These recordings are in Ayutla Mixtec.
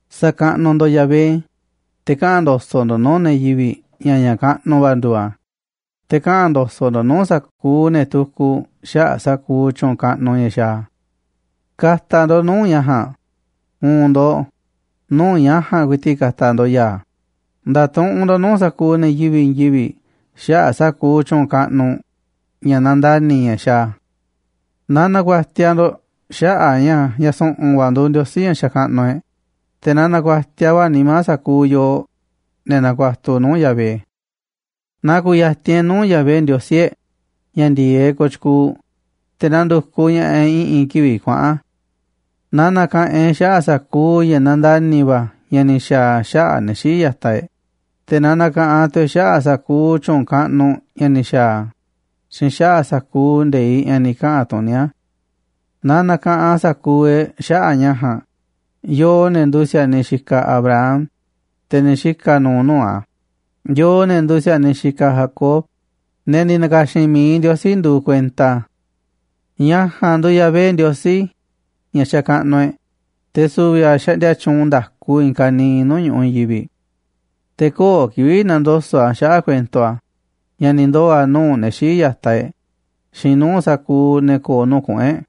Sa̱kaꞌnuꞌ ndo̱ꞌ Yahvé, te̱ kaꞌa̱n ndo̱so̱ꞌ ndo̱ꞌ nuu̱ꞌ ne̱ yivi̱ꞌ ña̱ ña̱ kaꞌnuꞌ va̱ nduuꞌ a̱, te̱ kaꞌa̱n ndo̱so̱ꞌ ndo̱ꞌ nuu̱ꞌ sa̱kuuꞌ ne̱ tukuꞌ xaꞌa̱ꞌ sa̱kuuꞌ tyu̱u̱n kaꞌnuꞌ ña̱ xaaꞌ a̱. Ka̱ta̱ ndo̱ꞌ nuu̱ꞌ ña̱ ja̱a̱nꞌ, u̱u̱n ndo̱ꞌ, nuu̱ꞌ ña̱ ja̱a̱nꞌ ku̱i̱ti̱ꞌ ka̱ta̱ ndo̱ꞌ ya̱a̱, nda̱tuꞌunꞌ ndo̱ꞌ nuu̱ꞌ sa̱kuuꞌ ne̱ yivi̱ꞌ i̱i̱n yivi̱ꞌ xaꞌa̱ꞌ sa̱kuuꞌ tyu̱u̱n kaꞌnuꞌ, ña̱ nandani̱, ña̱ xaaꞌ a̱. Na na̱ku̱a̱tiaꞌ ndo̱ꞌ xaꞌa̱ꞌ a̱ ña̱ ña̱ su̱ꞌu̱n va̱ nduuꞌ Ndiosí ña̱ xakaꞌnuꞌ e̱ꞌ, te̱ na na̱ku̱a̱tiaꞌ va̱ nimá sa̱kuuꞌ yooꞌ, ne̱ nakuatuꞌ nuu̱ꞌ Yahvé. Na ku̱ya̱ti̱n e̱ꞌ nuu̱ꞌ Yahvé Ndiosí e̱ꞌ ña̱ ndi̱e̱eꞌ kooꞌ tyukuuꞌ, te̱ na ndu̱kuꞌ ña̱ꞌaꞌ e̱ꞌ i̱ꞌi̱n kivi̱ꞌ kuaꞌa̱n. Na na̱ka̱ꞌanꞌ e̱ꞌ xaꞌa̱ꞌ sa̱kuuꞌ ña̱ nandani̱ va̱ ña̱ ni̱ xa̱a̱ a̱ xaꞌa̱ꞌ ne̱ xii̱ꞌ ya̱taꞌ e̱ꞌ, te̱ na na̱ka̱ꞌanꞌ tu̱ e̱ꞌ xaꞌa̱ꞌ sa̱kuuꞌ tyu̱u̱n kaꞌnuꞌ ña̱ ni̱ xa̱a̱ a̱ xiinꞌ xaꞌa̱ꞌ sa̱kuuꞌ nde̱iꞌ ña̱ ni̱ kaꞌa̱n tuní a̱. Na na̱ka̱ꞌanꞌ sa̱kuuꞌ e̱ꞌ xaꞌa̱ꞌ ña̱ ja̱a̱nꞌ, yooꞌ, ne̱ nduuꞌ si̱a̱niꞌ xikaꞌ Abraham, te̱ ni̱ xika̱ nu̱u̱ nuu̱ꞌ a̱, yooꞌ, ne̱ nduuꞌ si̱a̱niꞌ xikaꞌ Jacob, ne̱ ni̱ na̱ka̱xi̱n mi̱iꞌ Ndiosí nduuꞌ kuenta a̱. Ña̱ ja̱a̱nꞌ nduuꞌ Yahvé Ndiosí ña̱ xakaꞌnuꞌ e̱ꞌ, te̱ su̱vi̱ a̱ xaꞌndia tyuunꞌ nda̱ku i̱i̱n ka̱niiꞌ nuu̱ꞌ ñu̱ꞌuꞌ i̱i̱n yivi̱ꞌ. Te̱ köo̱ꞌ kivi̱ꞌ na̱ndoso̱ꞌ a̱ xaꞌa̱ꞌ kuento a̱, ña̱ ni̱ ndoo̱ a̱ nuu̱ꞌ ne̱ xii̱ꞌ ya̱taꞌ e̱ꞌ xiinꞌ nuu̱ꞌ sa̱kuuꞌ ne̱ ko̱o̱ nuu̱ꞌ kuꞌu̱n e̱ꞌ.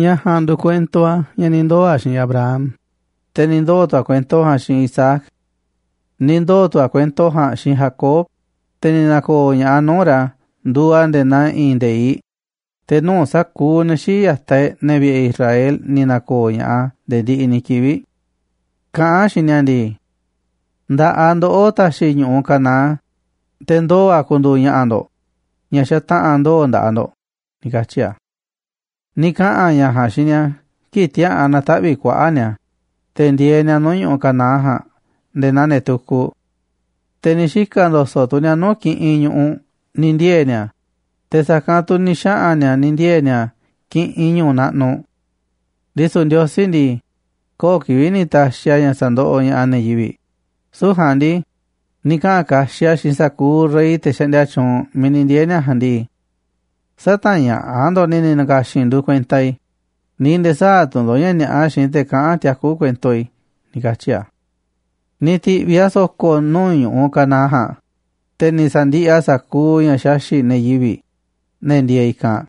Ña̱ ja̱a̱nꞌ nduuꞌ kuento a̱ ña̱ ni̱ ndoo̱ a̱ xiinꞌ Abraham, te̱ ni̱ ndoo̱ tu̱ a̱ kuento ja̱a̱nꞌ xiinꞌ Isaac. Ni̱ ndoo̱ tu̱ a̱ kuento ja̱a̱nꞌ xiinꞌ Jacob, te̱ ni̱ na̱ko̱o̱ ña̱ꞌaꞌ a̱ nuu̱ꞌ ra̱ nduuꞌ a̱ nde̱e̱ naa i̱i̱n nde̱iꞌ, te̱ nuu̱ꞌ sa̱kuuꞌ ne̱ xii̱ꞌ ya̱taꞌ e̱ꞌ, ne̱ vi̱ꞌe̱ Israel, ni̱ na̱ko̱o̱ ña̱ꞌaꞌ a̱ nde̱e̱ ndiꞌiꞌ ni̱ kivi̱ꞌ. Kaꞌán a̱ xiinꞌ ni̱a̱ ndii: “Nda̱ꞌaꞌ ndoꞌó ta̱xi̱ i̱ ñu̱ꞌuꞌ Canaán, te̱ ndoo̱ a̱ ku̱ndu̱u̱ ña̱ꞌa̱ ndo̱ꞌ, ña̱ xataꞌa̱n ndoo̱ nda̱ꞌaꞌ ndo̱ꞌ”, ni̱ katyi̱ a̱. Ni̱ kaꞌa̱n a̱ ña̱ ja̱a̱nꞌ xiinꞌ ni̱a̱ kii̱ꞌ tiäa̱ꞌan na̱taꞌvi̱ꞌ kuaꞌa̱ꞌ ni̱a̱, te̱ ndieeꞌ ni̱a̱ nuu̱ꞌ ñu̱ꞌuꞌ Canaán ja̱a̱nꞌ nde̱e̱ naa ne̱ tukuꞌ. Te̱ ni̱ xika̱ ndo̱so̱ꞌ tu̱ ni̱a̱ nuu̱ꞌ kiꞌinꞌ ñu̱ꞌuꞌ ni̱ ndiee̱ ni̱a̱, te̱ sa̱kanꞌ tu̱ ni̱ xaꞌa̱n ni̱a̱ ni̱ ndiee̱ ni̱a̱ kiꞌinꞌ ñu̱u̱ naꞌnuꞌ. Ndisu̱ Ndiosí ndii, köo̱ꞌ kivi̱ꞌ ni̱ ta̱xi̱ a̱ ña̱ sa̱ndoꞌoꞌ ña̱ꞌaꞌ ne̱ yivi̱ꞌ, süu̱ꞌ ja̱a̱nꞌ ndii, ni̱ kaꞌa̱n kaxiꞌ a̱ xiinꞌ sa̱kuuꞌ rey, te̱ xaꞌndia tyuunꞌ miiꞌ ni̱ ndiee̱ ni̱a̱ ja̱a̱nꞌ ndii: “Sä̱ta̱ñaꞌa̱ꞌ ndo̱ꞌ ne̱ ni̱ na̱ka̱xi̱n i̱ nduuꞌ kuenta i̱, ni̱ nde̱e̱ sä̱a̱ tu̱ ndo̱ꞌ ña̱ ni̱a̱ꞌa xiinꞌ te̱ kaꞌán tiakú kuento i̱”, ni̱ katyi̱ a̱. Ni̱ ti̱ꞌviꞌ a̱ so̱ko̱ nuu̱ꞌ ñu̱ꞌuꞌ Canaán ja̱a̱nꞌ, te̱ ni̱ sa̱ndiꞌiꞌ a̱ sa̱kuuꞌ ña̱ xaxi̱ꞌ ne̱ yivi̱ꞌ, ne̱ ndieeꞌ i̱kanꞌ.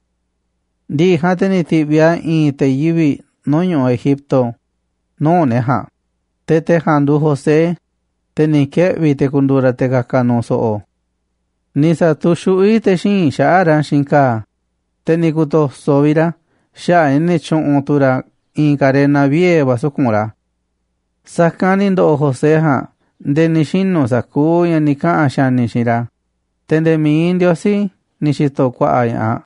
Ndi̱ꞌi̱ ja̱a̱nꞌ, te̱ ni̱ ti̱ꞌviꞌ a̱ i̱i̱n te̱ yivi̱ꞌ nuu̱ꞌ ñu̱ꞌuꞌ Egipto nuu̱ꞌ ne̱ ja̱a̱nꞌ, te̱ te̱ ja̱a̱nꞌ nduuꞌ José, te̱ ni̱ kieꞌvi̱ te̱ ku̱ndu̱u̱ ra̱ te̱ ka̱ka̱ nu̱u̱ so̱ꞌo̱. Ni̱ sa̱tu̱xuꞌví te̱ xíinꞌ xaꞌa̱ꞌ ra̱ xiinꞌ ka̱a̱, te̱ ni̱ ku̱to̱so̱ vi̱ꞌ ra̱ xaꞌa̱ꞌ a̱ ña̱ ni̱ tyu̱ꞌu̱n tu̱ ra̱ i̱i̱n karena vie̱ va̱ suku̱nꞌ ra̱. Sa̱kanꞌ ni̱ ndo̱ꞌo̱ José ja̱a̱nꞌ nde̱e̱ ni̱ xinu̱ sa̱kuuꞌ ña̱ ni̱ kaꞌa̱n xa̱ni̱ xiinꞌ ra̱, te̱ nde̱e̱ mi̱iꞌ Ndiosí ni̱ xi̱to̱ ku̱a̱ꞌa̱ ña̱ꞌaꞌ.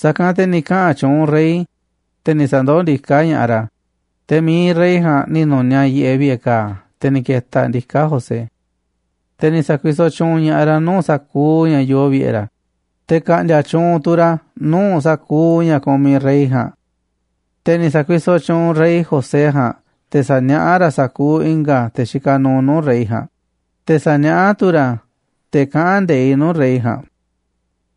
Sa̱kanꞌ te̱ ni̱ kaꞌa̱n tyuunꞌ rey, te̱ ni̱ sa̱ndoó ndiká ña̱ꞌaꞌ ra̱, te̱ mi̱iꞌ rey ja̱a̱nꞌ ni̱ nu̱niaꞌ yiꞌeꞌ vi̱ꞌe̱ ka̱a̱ te̱ ni̱ ke̱ta̱ ndiká José. Te̱ ni̱ sa̱kuisoꞌ tyuunꞌ ña̱ꞌaꞌ ra̱ nuu̱ꞌ sa̱kuuꞌ ña̱ yoo vi̱ꞌe̱ ra̱, te̱ ka̱ꞌndi̱a̱ tyuunꞌ tu̱ ra̱ nuu̱ꞌ sa̱kuuꞌ ña̱ kumiꞌ rey ja̱a̱nꞌ. Te̱ ni̱ sa̱kuisoꞌ tyuunꞌ rey José ja̱a̱nꞌ te̱ sa̱niaꞌá ra̱ sa̱kuuꞌ i̱nga̱ te̱ xikaꞌ nuuꞌ nuu̱ꞌ rey ja̱a̱nꞌ, te̱ sa̱niaꞌá tu̱ ra̱ te̱ kaꞌán nde̱iꞌ nuu̱ꞌ rey ja̱a̱nꞌ.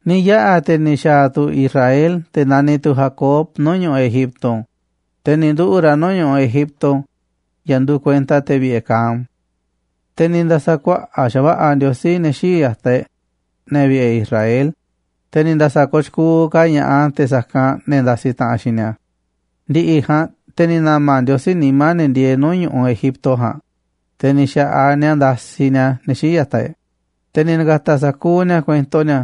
Ni̱ yaꞌa̱ te̱ ni̱ xa̱a̱ tu̱ Israel, te̱ naniꞌ tu̱ Jacob, nuu̱ꞌ ñu̱ꞌuꞌ Egipto, te̱ ni̱ nduꞌu̱ꞌ ra̱ nuu̱ꞌ ñu̱ꞌuꞌ Egipto ña̱ nduuꞌ kuenta te̱ vi̱ꞌe̱ Cam. Te̱ ni̱ nda̱sa̱ kuaꞌa̱ꞌ xa̱va̱ꞌa̱ Ndiosí ne̱ xii̱ꞌ ya̱taꞌ e̱ꞌ, ne̱ vi̱ꞌe̱ Israel, te̱ ni̱ nda̱sa̱ kooꞌ tyukuuꞌ ka̱ ña̱ꞌaꞌ a̱ te̱ sa̱kanꞌ ne̱ ndasi taꞌanꞌ xiinꞌ ni̱a̱. Ndi̱ꞌi̱ ja̱a̱nꞌ te̱ ni̱ na̱ma̱ Ndiosí nimá ne̱ ndieeꞌ nuu̱ꞌ ñu̱ꞌuꞌ Egipto ja̱a̱nꞌ, te̱ ni̱ xa̱ꞌaꞌ ni̱a̱ ndasiꞌ ni̱a̱ ne̱ xii̱ꞌ ya̱taꞌ e̱ꞌ, te̱ ni̱ na̱ka̱ta̱ sa̱kuuꞌ ni̱a̱ kuento ni̱a̱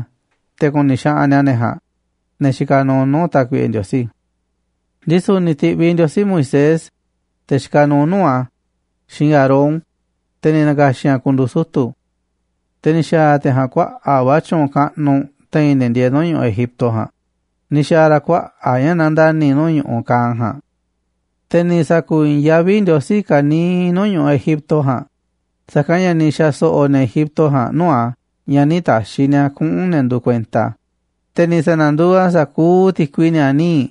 te̱ ku̱ni̱ xaꞌanꞌ ni̱a̱ ne̱ ja̱a̱nꞌ, ne̱ xikaꞌ nuuꞌ nuu̱ꞌ Tákuiꞌe Ndiosí. Ndisu̱ ni̱ ti̱ꞌviꞌ Ndiosí Moisés, te̱ xikaꞌ nuuꞌ nuu̱ꞌ a̱, xiinꞌ Aarón, te̱ ni̱ na̱ka̱xi̱n a̱ ku̱ndu̱u̱ sutu̱. Te̱ ni̱ xa̱a̱ te̱ ja̱a̱nꞌ kuaꞌa̱ꞌ va̱ tyu̱u̱n kaꞌnuꞌ te̱i̱n ne̱ ndieeꞌ nuu̱ꞌ ñu̱ꞌuꞌ Egipto ja̱a̱nꞌ, ni̱ xa̱a̱ ra̱ kuaꞌa̱ꞌ ña̱ nandani̱ nuu̱ꞌ ñu̱ꞌuꞌ Cam ja̱a̱nꞌ. Te̱ ni̱ sa̱ku̱i̱i̱n yaví Ndiosí ka̱niiꞌ nuu̱ꞌ ñu̱ꞌuꞌ Egipto ja̱a̱nꞌ, sa̱kanꞌ ña̱ ni̱ xa̱so̱ꞌo̱ ne̱ Egipto ja̱a̱nꞌ nuu̱ꞌ a̱ ña̱ nï̱ ta̱xi̱ ni̱a̱ kuꞌu̱n ne̱ nduuꞌ kuenta a̱. Te̱ ni̱ sa̱na̱nduuꞌ a̱ sa̱kuuꞌ ti̱kui ni̱a̱ níiꞌ,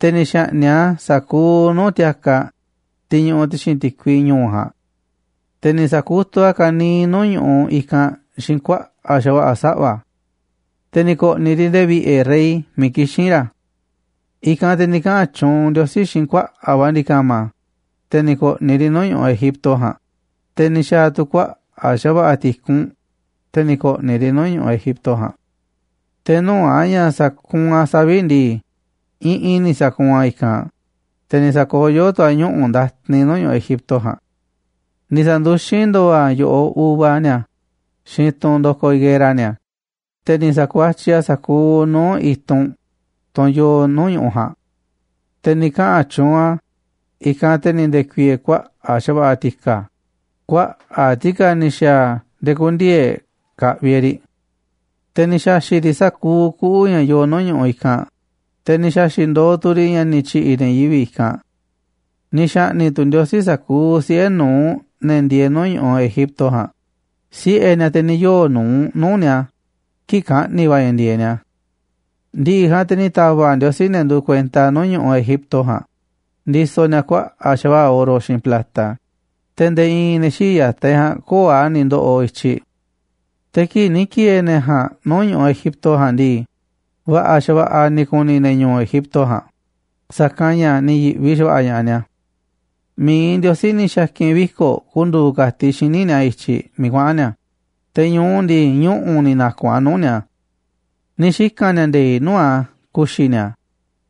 te̱ ni̱ xa̱ꞌni̱ꞌ a̱ sa̱kuuꞌ nuu̱ꞌ ti̱a̱kaꞌ, tiꞌ ñuꞌuꞌ ti̱xi̱n ti̱kui ñu̱u̱ ja̱a̱nꞌ. Te̱ ni̱ sa̱kutuꞌ a̱ ka̱niiꞌ nuu̱ꞌ ñu̱ꞌuꞌ i̱kanꞌ xiinꞌ kuaꞌa̱ꞌ xa̱va̱ꞌa̱ saꞌva̱, te̱ ni̱ ko̱ꞌni̱ riꞌ nde̱e̱ vi̱ꞌe̱ rey miiꞌ kixín ra̱. I̱kanꞌ te̱ ni̱ kaꞌa̱n tyuunꞌ Ndiosí xiinꞌ kuaꞌa̱ꞌ va̱ ndi̱ka̱ma̱, te̱ ni̱ ko̱ꞌni̱ riꞌ nuu̱ꞌ ñu̱ꞌuꞌ Egipto ja̱a̱nꞌ, te̱ ni̱ xa̱a̱ tu̱ kuaꞌa̱ꞌ xa̱va̱ꞌa̱ ti̱kunꞌ, te̱ ni̱ ko̱ꞌni̱ riꞌ nuu̱ꞌ ñu̱ꞌuꞌ Egipto ja̱a̱nꞌ. Te̱ nuu̱ꞌ a̱ ña̱ sa̱kuunꞌ a̱ savi̱ꞌ ndii, iꞌinꞌ ni̱ sa̱kuunꞌ a̱ i̱kanꞌ, te̱ ni̱ sa̱koyó tu̱ a̱ ñuꞌu̱ ndatin nuu̱ꞌ ñu̱ꞌuꞌ Egipto ja̱a̱nꞌ. Ni̱ sa̱nduxín ndo̱o̱ a̱ yo̱ꞌoꞌ uva ni̱a̱ xiinꞌ tunꞌ ndo̱koꞌ higuera ni̱a̱, te̱ ni̱ sa̱kuatyiꞌ a̱ sa̱kuuꞌ nuu̱ꞌ i̱tunꞌ, tunꞌ yoo nuuꞌ ñu̱ꞌuꞌ ja̱a̱nꞌ. Te̱ ni̱ kaꞌa̱n tyuunꞌ a̱, i̱kanꞌ te̱ ni̱ nde̱ku̱i̱e̱e̱ kuaꞌa̱ꞌ xa̱va̱ꞌa̱ ti̱ka̱, kuaꞌa̱ꞌ ti̱ka̱ ni̱ xa̱a̱ nde̱e̱ kü̱ndi̱e̱eꞌ e̱ꞌ ka̱ꞌvi̱ e̱ꞌ riꞌ. Te̱ ni̱ xa̱xi̱ꞌ riꞌ sa̱kuuꞌ kuꞌu̱ ña̱ yoo nuu̱ꞌ ñu̱ꞌuꞌ i̱kanꞌ, te̱ ni̱ xa̱xi̱ꞌ ndooꞌ tu̱ riꞌ ña̱ ni̱ tyi̱ꞌi̱ ne̱ yivi̱ꞌ i̱kanꞌ. Ni̱ xa̱ꞌni̱ꞌ tu̱ Ndiosí sa̱kuuꞌ siꞌe̱ nu̱uꞌ ne̱ ndieeꞌ nuu̱ꞌ ñu̱ꞌuꞌ Egipto ja̱a̱nꞌ, siꞌe̱ ni̱a̱, te̱ ni̱ yoo̱ nu̱uꞌ nuu̱ꞌ ni̱a̱ kii̱ꞌ kaꞌni̱ va̱ ña̱ ndi̱e̱eꞌ ni̱a̱. Ndi̱ꞌi̱ ja̱a̱nꞌ te̱ ni̱ ta̱va̱ꞌ Ndiosí ne̱ nduuꞌ kuenta a̱ nuu̱ꞌ ñu̱ꞌuꞌ Egipto ja̱a̱nꞌ, ndisoꞌ ni̱a̱ kuaꞌa̱ꞌ xa̱va̱ꞌa̱ oro xiinꞌ plata, te̱ nde̱e̱ i̱i̱n ne̱ xii̱ꞌ ya̱taꞌ e̱ꞌ ja̱a̱nꞌ köo̱ꞌ a̱ ni̱ ndo̱ꞌo̱ i̱tyiꞌ. Te̱ kii̱ꞌ ni̱ ki̱e̱e̱ ne̱ ja̱a̱nꞌ nuu̱ꞌ ñu̱ꞌuꞌ Egipto ja̱a̱nꞌ ndii, va̱ꞌa̱ xa̱va̱ꞌa̱ ni̱ ku̱ni̱ ne̱ ñu̱u̱ Egipto ja̱a̱nꞌ, sa̱kanꞌ ña̱ ni̱ yi̱ꞌvi xa̱va̱ꞌa̱ ña̱ꞌaꞌ ni̱a̱. Mi̱iꞌ Ndiosí ni̱ xa̱ki̱n viko̱ꞌ ku̱ndu̱u̱ ka̱tiꞌ xíniꞌ ni̱a̱ i̱tyiꞌ miiꞌ kuaꞌa̱n ni̱a̱, te̱ ñu̱u ndii, ñuꞌu̱ ni̱ na̱ku̱nꞌ a̱ nuu̱ꞌ ni̱a̱. Ni̱ xika̱n ni̱a̱ nde̱i̱ꞌ nuu̱ꞌ a̱ ku̱xi̱ ni̱a̱,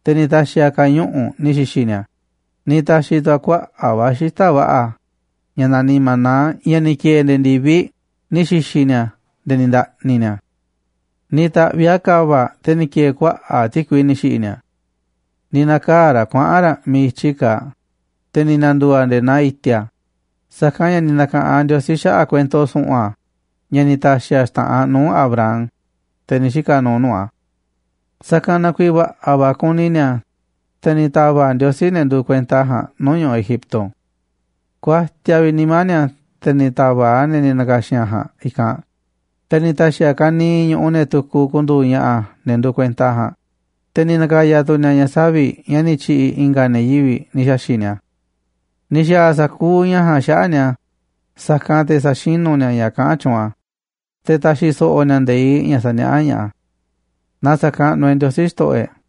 te̱ ni̱ ta̱xi̱ a̱ ka̱ñuꞌu̱ꞌ ni̱ xi̱xi̱ ni̱a̱, ni̱ ta̱xi̱ tu̱ a̱ kuaꞌa̱ꞌ va̱ xita̱ꞌ va̱ꞌa̱ ña̱ naniꞌ maná, ña̱ ni̱ ki̱e̱e̱ nde̱e̱ ndi̱viꞌ ni̱ xi̱xi̱ ni̱a̱ nde̱e̱ ni̱ nda̱ꞌni̱ ni̱a̱. Ni̱ ta̱ꞌviꞌ a̱ ka̱va̱ꞌ, te̱ ni̱ ki̱e̱e̱ kuaꞌa̱ꞌ ti̱kui ni̱ xi̱ꞌi̱ ni̱a̱. Ni̱ na̱kaa̱ raꞌ kuaꞌa̱n raꞌ miiꞌ i̱tyi kaaꞌ, te̱ ni̱ na̱ndu̱u̱ a̱ nde̱e̱ naa i̱ti̱a̱. Sa̱kanꞌ ña̱ ni̱ na̱ka̱ꞌanꞌ Ndiosí xaꞌa̱ꞌ kuento su̱ꞌu̱n a̱ ña̱ ni̱ ta̱xi̱ a̱ xta̱ꞌanꞌ nuu̱ꞌ Abraham, te̱ ni̱ xika̱ nuuꞌ nuu̱ꞌ a̱. Sa̱kanꞌ na kuiiꞌ va̱ꞌa̱ va̱ kuni ni̱a̱, te̱ ni̱ ta̱va̱ꞌ Ndiosí ne̱ nduuꞌ kuenta a̱ ja̱a̱nꞌ nuu̱ꞌ ñu̱ꞌuꞌ Egipto. Kuatiaꞌ vi̱ꞌ nimá ni̱a̱, te̱ ni̱ ta̱va̱ꞌ a̱ ne̱ ni̱ na̱ka̱xi̱n a̱ ja̱a̱nꞌ i̱kanꞌ. Te̱ ni̱ ta̱xi̱ a̱ ka̱niiꞌ ñu̱ꞌuꞌ ne̱ tukuꞌ ku̱ndu̱u̱ ña̱ꞌa̱ ne̱ nduuꞌ kuenta a̱ ja̱a̱nꞌ, te̱ ni̱ na̱ka̱ya̱ tu̱ ni̱a̱ ña̱ savi̱ꞌ ña̱ ni̱ tyi̱ꞌi̱ i̱nga̱ ne̱ yivi̱ꞌ ni̱ xa̱xi̱ꞌ ni̱a̱. Ni̱ xa̱a̱ a̱ sa̱kuuꞌ ña̱ ja̱a̱nꞌ xaꞌa̱ꞌ ni̱a̱, sa̱kanꞌ te̱ sa̱xinú ni̱a̱ ña̱ kaꞌán tyuunꞌ a̱, te̱ ta̱xi̱ so̱ꞌo̱ ni̱a̱ nde̱iꞌ ña̱ saniaꞌá ña̱ꞌaꞌ a̱. Na sa̱kaꞌnuꞌ e̱ꞌ Ndiosí, Xto̱ꞌo̱ e̱ꞌ.